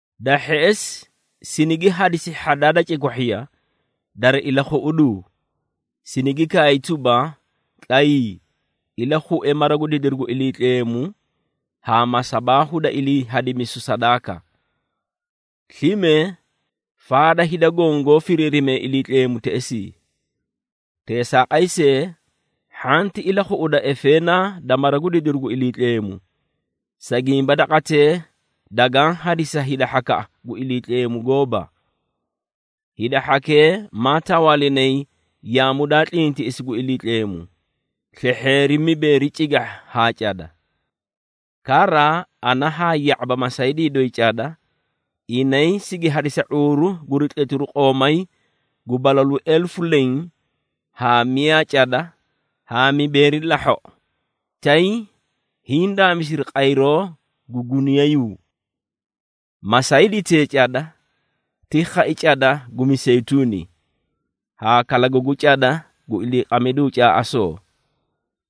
Da hheꞌesi, sinigi hadisi hhadaa da cikwahhiya dari ilakhuꞌuduu, sinigi kaay tuba, “Tlayii, ilakhue mara gu didiru gu Iliitleemu haa masabaahu da ilii hadimisu sadaaka. Slime faada hida goõ goó firiirimee Iliitleemu teꞌesii. Teesaaqay see, hhanti ilakhuꞌuda efeenaa da mara gu didiru gu Iliitleemu, sa gimba daqatee dagaã hadisi sa hida hhakaꞌa gu Iliitleemu gooba. Hida hhakee maa tawaalinay yaamu daa tlintiꞌisi gu Iliitleemu, slehheeri mibeeri cigahha haa cada. Kara, ana haa ya⁄aba masaydii doyi cada, inay sigi hadisa ⁄uuru guri tletiru qoomay gu balalu elefu leẽ haa miyaa cada haa mibeeri lahhoꞌo, tay hiĩ daamisiri qayroo gu guniyayuu.” Masayditee cada ti khai cada gu miseyituuni haa kalagagu cada gu iliiqamidu caaꞌasoo,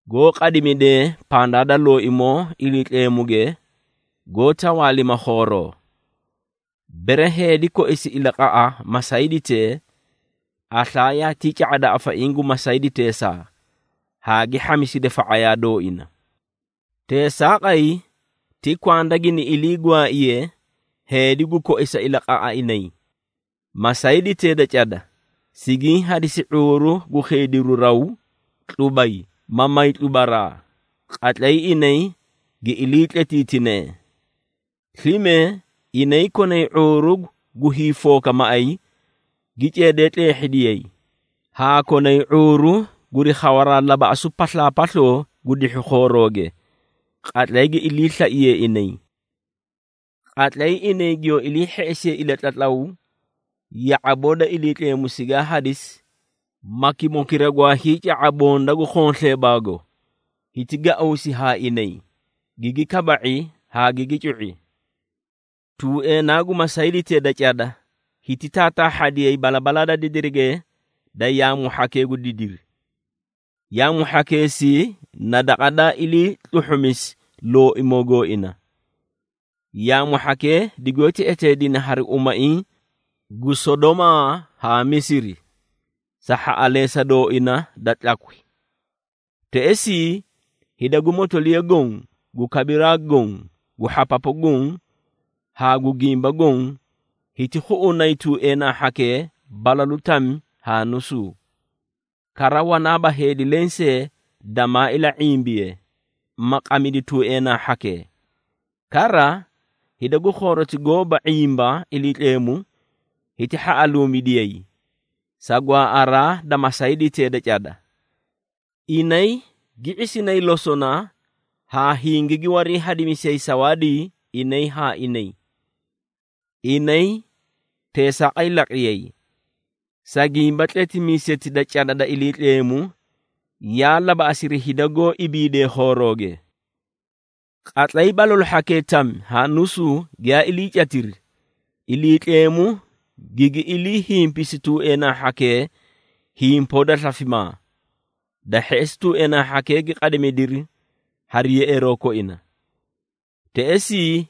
goó qadimidee pandaa da Looimoo, Iliitleemuge goó tawaalima khooroo. Bere heedi koisi ilaqaꞌa masayditee, aslaa yaatii ca⁄ada afaiĩ gu masayditeesaa haa gi hhamisida fa⁄ayaa dooina. Teesaaqay, ti kwanda gini ilii gwaaiye heedi gu koisa ilaqaꞌa inay. Masayditee da cada sigiĩ hadisi ⁄uuru gu khiidiru raw, tlubay ma may tlubaraa, qatlay inay gi iliitletiitinee. Slime inay konay ⁄uuru gu hiifooka maꞌay, gi ceedee tleehhidiyay, haa konay ⁄uuru guri khawaraa labaꞌasu paslaapasloo gu dihhu khooroge, qatlay gi iliislaiyee inay. Qatlay inay giyoo iliihheꞌesiyee ilatlatlaw ya⁄aboo da Iliitleemu sigaa hadisi, makimokira gwaa hiica⁄a bonda gu khonsleebaago, hiti gauusi haa inay, gigi kaba⁄i haa gigi cu⁄i. Tuueenaa gu masayditee da cada, hiti taataahhadiyay balabalaa da didirige da yaamu hhakee gu didiri. Yaamu hhakeesii na daqa daa ilii tluhhumisi Looimoo gooina. Yaamu hhakee digoóti eteedine hari umaiĩ gu Sodomaa haa Misiri, sa hhaꞌaleesa dooina da tlakwi. Teꞌesii, hida gu motoliya goõ, gu kabiraa goõ, gu hhapapu goõ haa gu gimba goõ, hiti khuꞌunay tuueenaa hhakee balalu tami haa nusuu, kara wanaaba heedi lensee damaa ila⁄imbiye, ma qamidi tuueenaa hhakee. Kara, hida gu khooroti goóba ⁄imba Iliitleemu, hiti hhaꞌaluumidiyay, sa gwaaꞌaraa da masayditee da cada. Inay gi ⁄isinay losona haa hingigi warii hadimisiyay sawaadii inay haa inay. Inay teesaaqay laqiyay, sa gimba tletimiiseti da cada da Iliitleemu, yaa labaꞌasiri hida goó ibiidee khooroge. Qatlay balalu hhakee tami haa nusuu giyaa iliicatiri, Iliitleemu gigi iliihimpisi tuueenaa hhakee himpoo da slafimaa. Da hheꞌesi, tuueenaa hhakee gi qadimidiri hari yeꞌeeroo koina. Teꞌesii,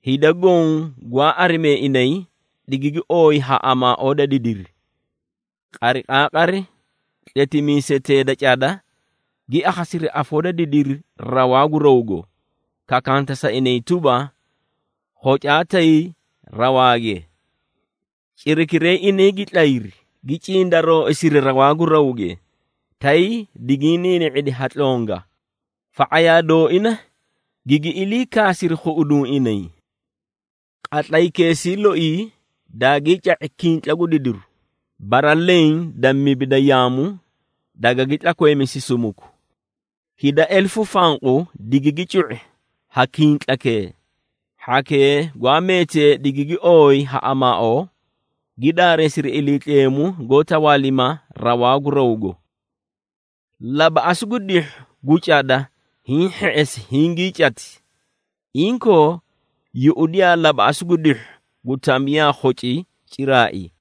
hida goõ gwaa arimee inay, digigi ooyi ha amaaoo da didiri. Qariqaaqari, tletimiisetee da cada, gi akhasiri afoo da didiri rawaa gu rawgo, kakanta sa inay tuba, “Khocaa tay rawaage!” Cirakiray inay gi tlayri, gi cindarooisiri rawaa gu rawge, tay digiĩ niini⁄idi ha tlonga, fa⁄ayaa dooina gigi ilii kaasiri khuꞌuduũ inay. Qatlaykeesii loii daagii ca⁄i kintla gu didiru, bara leẽ da mibi da yaamu dagagi tlakweemisi sumuku. Hida elefu fanqu digigi cu⁄i ha kintlakee, hhakee gwaa meetee digigi ooyi ha amaaoo, gi daareesiri Iliitleemu goó tawaalima rawaa gu rawgo. Labaꞌasu gu dihhu gu cada hiĩ hheꞌesi hingii cati. Inkoo, yuꞌudiyaa labaꞌasu gu dihhu gu tami yaa khoci ciraai.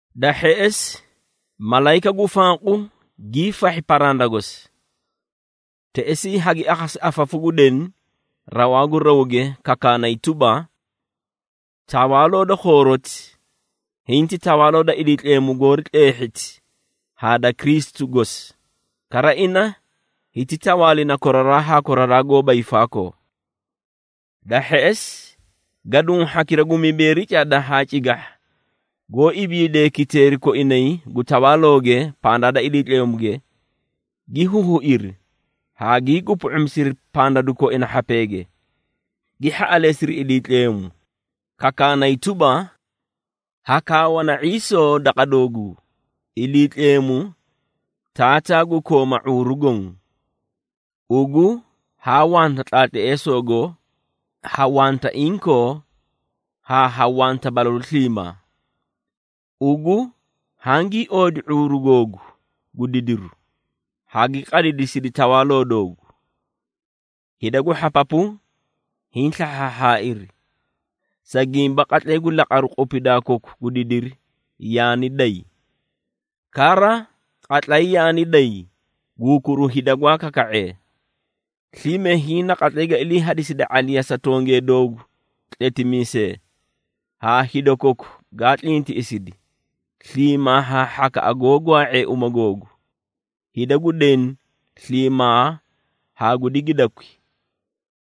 Da hheꞌesi, malayika gu fanqu giifahhi paranda gosi. Teꞌesii hagi akhasi afafu gu deni rawaa gu rawge kakaanay tuba: “Tawaaloo da khooroti, hinti tawaaloo da Iliitleemu goori tleehhiti haa da Kristu gosi, kara ina hiti tawaalina koraraa haa koraraa goóba hiifaakoo.” Da hheꞌesi, gaduũ hhakira gu mibeeri cada haa cigahha, goó ibiidee kiteeri koinay gu tawaalooge pandaa da Iliitleemuge, gi huhuiri haa gii gupu⁄umisiri pandadu koina hhapeege, gi hhaꞌaleesiri Iliitleemu, kakaanay tuba, “Hakaawana ⁄iisoo, daqa dooguu, Iliitleemu Taataa gu kooma ⁄uuru goõ, Ugu haa wanta tlaatleesoogo ha wanta inkoo haa ha wanta balalu sliimaa. Ugu hangii oodi ⁄uuru googu gu didiru, haa gi qadidisidi tawaaloo doogu. Hida gu hhapapu hiĩ slahhaahhaairi, sa gimba qatlay gu laqaru qupidaa koku gu didiri yaani day. Kara qatlay yaani day, gu hukuru hida gwaa kaka⁄ee. Slime hiĩ na qatlay ga iliihadiside ⁄aliya sa tongee doogu tletimiisee, haa hida koku gaa tlintiꞌisidi, sliimaa haa hhakaꞌa goó gwaa⁄ee uma googu. Hida gu deni sliimaa haa gu digidakwi,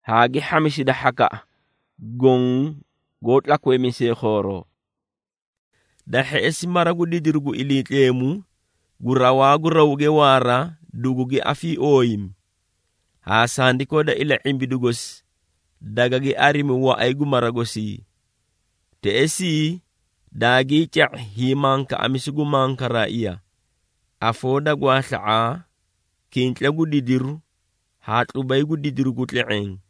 haa gi hhamisida hhakaꞌa goõ goó tlakweemisee khooroo.” Da hheꞌesi, mara gu didiru gu Iliitleemu gu rawaa gu rawge waara dugugi afiiooyimi, haa sandikoo da ila⁄imbidu gosi dagagi arimi waꞌay gu mara gosii. Teꞌesii daagii ca⁄i hiimankaꞌamisu gu mankaraaiya, afoo da gwaasla⁄aa, kintla gu didiru haa tlubay gu didiru gu tle⁄eẽ.